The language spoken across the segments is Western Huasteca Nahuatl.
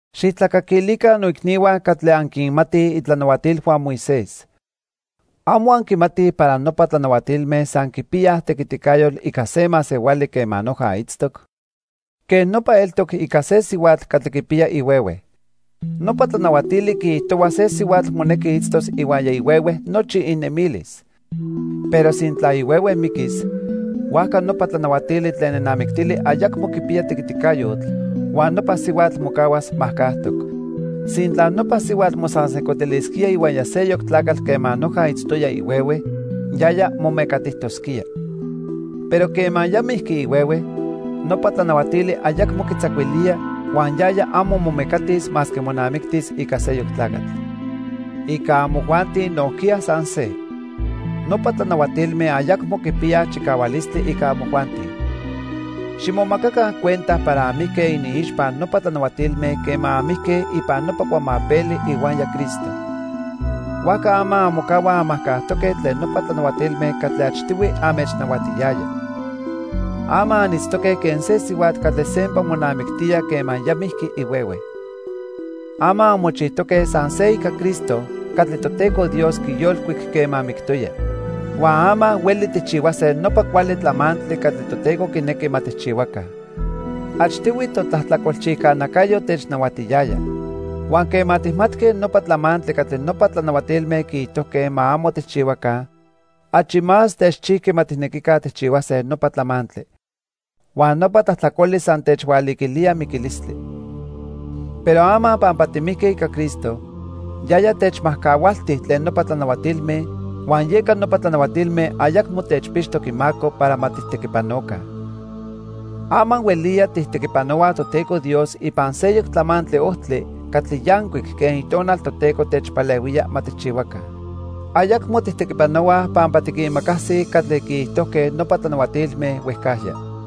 Xijtlacaquilica noicnihua catli anquinmatij itlanahuatilhua Moisés. ¿Amo anquimatij para nopa tlanahuatilme san quipiyaj tequiticayotl ica se masehuali quema noja itztoc? Quej nopa eltoc ica se sihuatl catli quipiya ihuehue. Nopa tlanahuatili quiijtohua se sihuatl monequi itztos ihuaya ihuehue nochi inemilis. Pero sintla ihuehue miquis, huajca nopa tlanahuatili tlen nenamictili ayacmo quipiya tequiticayotl, huan nopa sihuatl mocahuas majcajtoc. Sintla nopa sihuatl mosansejcotilisquía ihuaya seyoc tlacatl quema noja itztoya ihuehue, yaya momecatijtosquía. Pero quema ya mijqui ihuehue, nopa tlanahuatili ayacmo quitzacuilía huan yaya amo momecatis masque monamictis ica seyoc tlacatl. Ica amojuanti nojquiya san se. Nopa tlanahuatilme ayacmo quipiyaj chicahualistli ica amojuanti. Ximomacaca cuenta para anmijque iniixpa nopa tlanahuatilme quema anmijque ipan nopa cuamapeli ihuaya Cristo. Huajca ama anmocahuaj anmajcajtoque tlen nopa tlanahuatilme catli achtihui anmechnahuatiyaya. Ama anitztoque quen se sihuatl catli sempa monamictía quema ya mijqui ihuehue. Ama anmochijtoque san se ica Cristo catli Toteco Dios quiyolcuic quema mictoya. Huan ama hueli tijchihuase nopa cuali tlamantli catli Toteco quinequi ma tijchihuaca. Achtihui totlajtlacolchijca nacayo technahuatiyaya. Huan quema tijmatque nopa tlamantli catli nopa tlanahuatilme quiijtojque ma amo tijchihuaca, achi más techchijqui ma tijnequica tijchihuase nopa tlamantli. Huan nopa tlajtlacoli san tehualiquilía miquilistli. Pero ama pampa timijque ica Cristo, yaya techmajcahualti tlen nopa tlanahuatilme huan yeca nopa tlanahuatilme ayacmo techpixtoc imaco para ma tijtequipanoca. Ama hueliya tijtequipanohuaj Toteco Dios ipan seyoc tlamantli ojtli catli yancuic quen Itonal techpalehuía ma tijchihuaca. Ayacmo tijtequipanohuaj pampa tiquimacasij catli quiijtojque nopa tlanahuatilme huejcajya.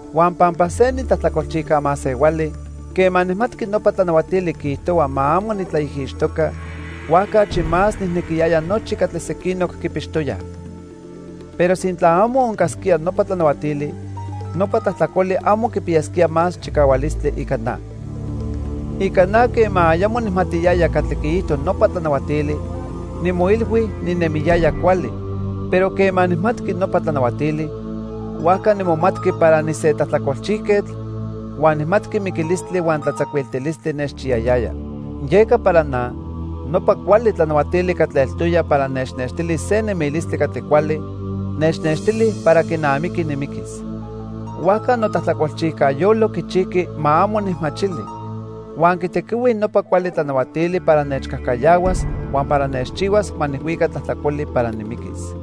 Huan pampa se nitlajtlacolchijca masehuali, quema nijmatqui nopa tlanahuatili quiijtohua ma amo nitlaijixtoca, huajca achi más nijnequiyaya nochi catli sequinoc quipixtoyaj. Pero sintla amo oncasquía nopa tlanahuatili, nopa tlajtlacoli amo quipiyasquía más chicahualistli ica na. Ica na quema ayamo nijmatiyaya catli quiijto nopa tlanahuatili, nimoilhui ninemiyaya cuali, pero quema nijmatqui nopa tlanahuatili, huajca nimomatqui para nise tlajtlacolchijquetl huan nijmatqui miquilistli huan tlatzacuiltilistli nechchiyayaya. Yeca para na, nopa cuali tlanahuatili catli eltoya para nechnextilis se nemilistli catli cuali, nechnextili para quinamiqui nimiquis. Huajca notlajtlacolchijca yolo quichijqui ma amo nijmachili, huan quitequihui nopa cuali tlanahuatili para nechcajcayahuas huan para nechchihuas ma nijhuica tlajtlacoli para nimiquis.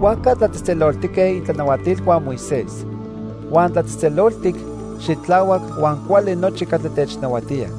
Huajca tlatzejtzeloltique itlanahuatilhua Moisés. Huan tlatzejtzeloltic, xitlahuac huan cuali nochi catli technahuatía.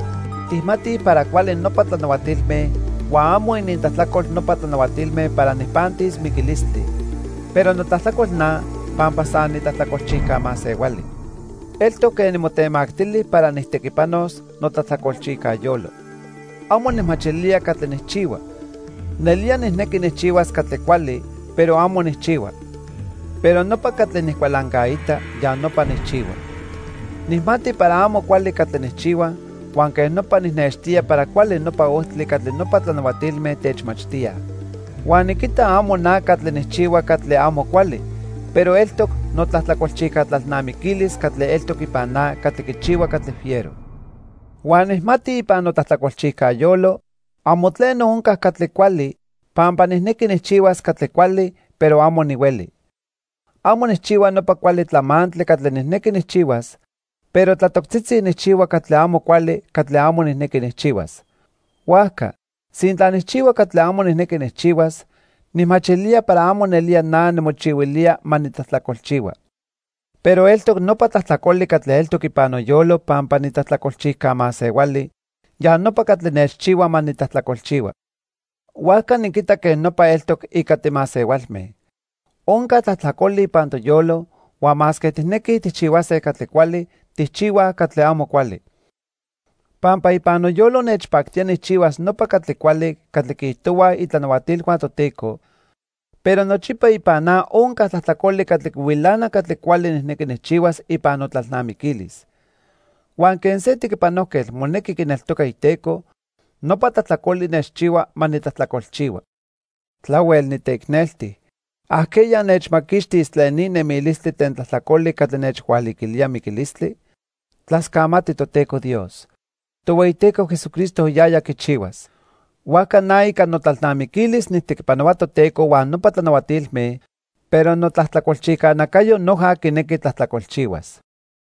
Tijmatij para cuali nopa tlanahuatilme huan amo inintlajtlacol nopa tlanahuatilme para nijpantis miquilistli, pero notlajtlacol na pampa san nitlajtlacolchijca masehuali. Eltoc quen nimotemactili para nijtequipanos notlajtlacolchijca yolo. Amo nijmachilía catli nijchihua. Nelía nijnequi nijchihuas catli cuali, pero amo nijchihua. Pero nopa catli nijcualancaita, ya nopa nijchihua. Nijmati para amo cuali catli nijchihua, huan quej nopa nijnextía para cuali nopa ojtli catli nopa tlanahuatilme techmachtíaj. Huan niquita amo na catli nijchihua catli amo cuali, pero eltoc notlajtlacolchijca tlalnamiquilis catli eltoc ipan na catli quichihua catli fiero. Huan nijmati ipan notlajtlacolchijca yolo, amo tleno onca catli cuali, pampa nijnequi nijchihuas catli cuali, pero amo nihueli. Amo nijchihua nopa cuali tlamantli catli nijnequi nijchihuas, pero tlatoctzitzi nijchihua catli amo cuali catli amo nijnequi nijchihuas. Huajca, sintla nijchihua catli amo nijnequi nijchihuas, nijmachilía para amo nelía na nimochihuilía ma nitlajtlacolchihua. Pero eltoc nopa tlajtlacoli catli eltoc ipan noyolo pampa nitlajtlacolchijca masehuali, ya nopa catli nechchihua ma nitlajtlacolchihua. Huajca niquita quej nopa eltoc ica timasehualme. Onca tlajtlacoli ipan toyolo, huan masque tijnequij tijchihuase catli cuali, tijchihuaj catli amo cuali. Pampa ipan noyolo nechpactía nijchihuas nopa catli cuali catli quiijtohuaj itlanahuatilhua Toteco, pero nochipa ipan na onca tlajtlacoli catli quihuilana catli cuali nijnequi nijchihuas ipan notlalnamiquilis. Huan quen se tequipanojquetl monequi quineltoca iteco, nopa tlajtlacoli nechchihua ma nitlajtlacolchihua. ¡Tlahuel niteicnelti! ¿Ajqueya nechmaquixtis tlen ni nemilistli tlen tlajtlacoli catli nechhualiquilía miquilistli? Tlascamati Toteco Dios. Tohueyiteco Jesucristo yaya quichihuas. Huajca na ica notlalnamiquilis nijtequipanohua Toteco huan nopa tlanahuatilme, pero notlajtlacolchijca nacayo noja quinequi tlajtlacolchihuas.